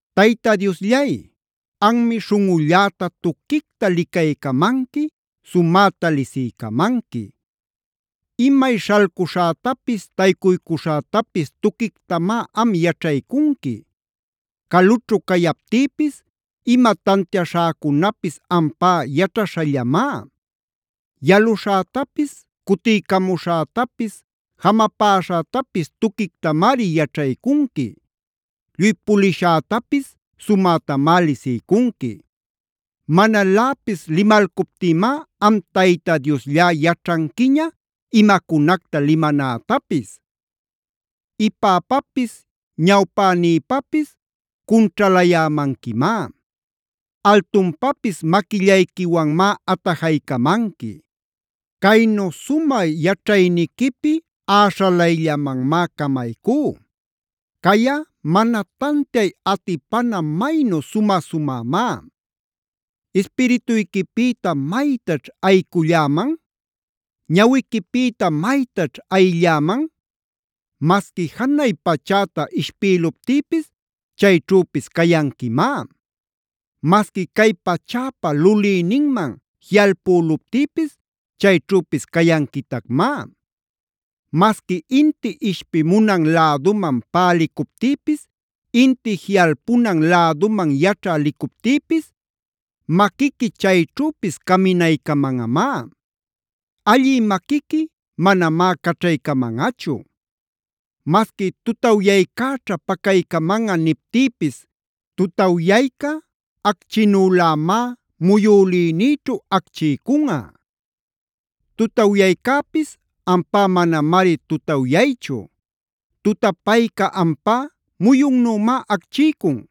Tayta Diosllay, anmi śhunꞌulläta tuquicta licaycamanqui, sumäta lisiycamanqui. Imay śhalcuśhätapis taycuycuśhätapis tuquictamá am yaćhaycunqui. Calućhu cayaptïpis ima tantiaśhäcunapis ampá yaćhaśhallamá. Yaluśhätapis, cutiycamuśhätapis, jamapäśhätapis tuquictamari yaćhaycunqui. Lluy puliśhätapis sumätamá lisiycunqui. Manaläpis limalcuptïmá am Tayta Diosllá yaćhanquiña imacunacta limanätapis. Ipäpapis ñawpänïpapis cunćhalayämanquimá. Altunpapis maquillayquiwanmá atajaycamanqui. Caynu sumä yaćhayniquipi äśhalayllamanmá camaycú. Cayꞌa mana tantiay atipana maynu sumä-sumämá. ¿Ispirituyquipïta maytaćh ayiculläman? ¿Ñawiquipïta maytaćh ayilläman? Masqui janay pachäta ishpïluptïpis chayćhüpis cayanquimá. Masqui cay pachäpa lulïninman jiꞌalpüluptïpis chayćhüpis cayanquitacmá. Masqui inti ishpimunan läduman pälicuptïpis, inti jiꞌalpunan läduman yaćhä licuptïpis, maquiqui chayćhüpis caminaycamanꞌamá. Allï maquiqui manamá caćhaycamanꞌachu. Masqui “tutawyaycäćha pacaycamanꞌa” niptïpis tutawyayca acchinülämá muyülïnïćhu acchiycunꞌa. Tutawyaycäpis ampá manamari tutawyaychu. Tutapayca ampá muyunnümá acchiycun.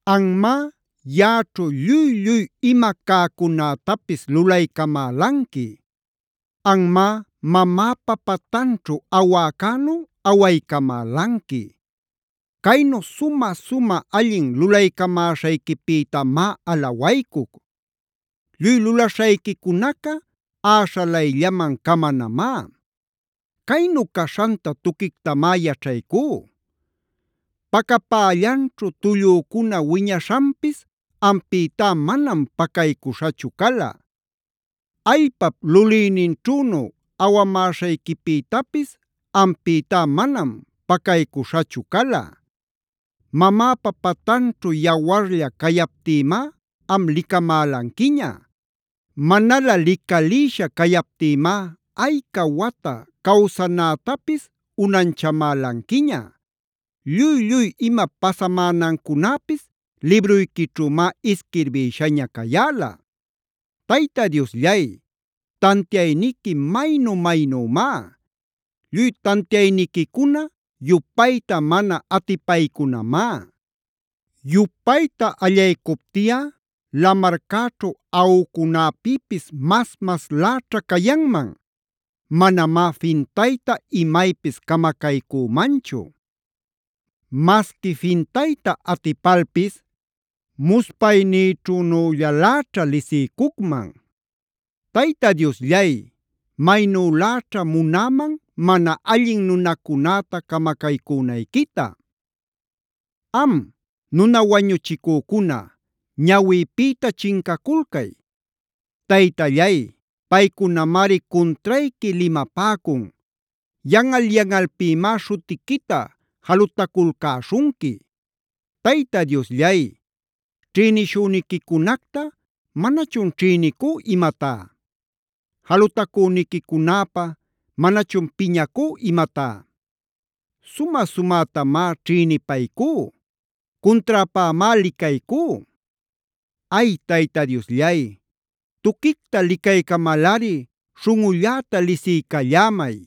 Anmá yaꞌaćhu lluy-lluy ima cäcunätapis lulaycamälanqui. Anmá mamäpa patanćhu awäcänu awaycamälanqui. Caynu sumä-sumä allin lulaycamäśhayquipïtamá alawaycuc. Lluy lulaśhayquicunaca äśhalayllaman camanamá. Caynu caśhanta tuquictamá yaćhaycú. Pacapällanćhu tullücuna wiñaśhanpis ampïtá manam pacaycuśhachu cala. Allpap lulïninćhünu awamäśhayquipïtapis ampïtá manam pacaycuśhachu cala. Mamäpa patanćhu yawarlla cayaptïmá am licamälanquiña. Manalä licalïsha cayaptïmá ayca wata cawsanätapis unanchamälanquiña. Lluy-lluy ima pasamänancunäpis libruyquićhümá isquirbïshaña cayäla. Tayta Diosllay, ¡tantiayniqui maynu-maynümá! ¡Lluy tantiayniquicuna yupayta mana atipaycunamá! Yupayta allaycuptiꞌa lamarcäćhu aꞌucunäpïpis mas-masläćha cayanman. Manamá fintayta imaypis camacaycümanchu. Masqui fintayta atipalpis muspaynïćhünüllaläćhá lisiycucman. Tayta Diosllay, maynüläćha munäman mana allin nunacunäta camacaycünayquita. Am, nuna wañuchicücuna, ñawïpïta chincaculcay. Taytallay, paycunamari cuntrayqui limapäcun. Yanꞌal-yanꞌalpïmá śhutiquita jalutaculcäśhunqui. Tayta Diosllay, ¿ćhïnishüniquicunacta manachun ćhïnicú imatá? ¿Jalutacüniquicunäpä manachun piñacú imatá? Sumä-sumätamá ćhïnipaycú. Cunträpämá licaycú. Ay, Tayta Diosllay, tuquicta licaycamalꞌari śhunꞌulläta lisiycallämay.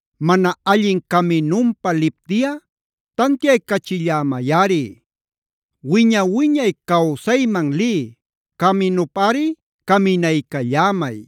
Mana allin caminunpa liptiꞌa tantiaycachillämayꞌari. Wiña-wiñay cawsayman lï caminupꞌari caminaycallämay.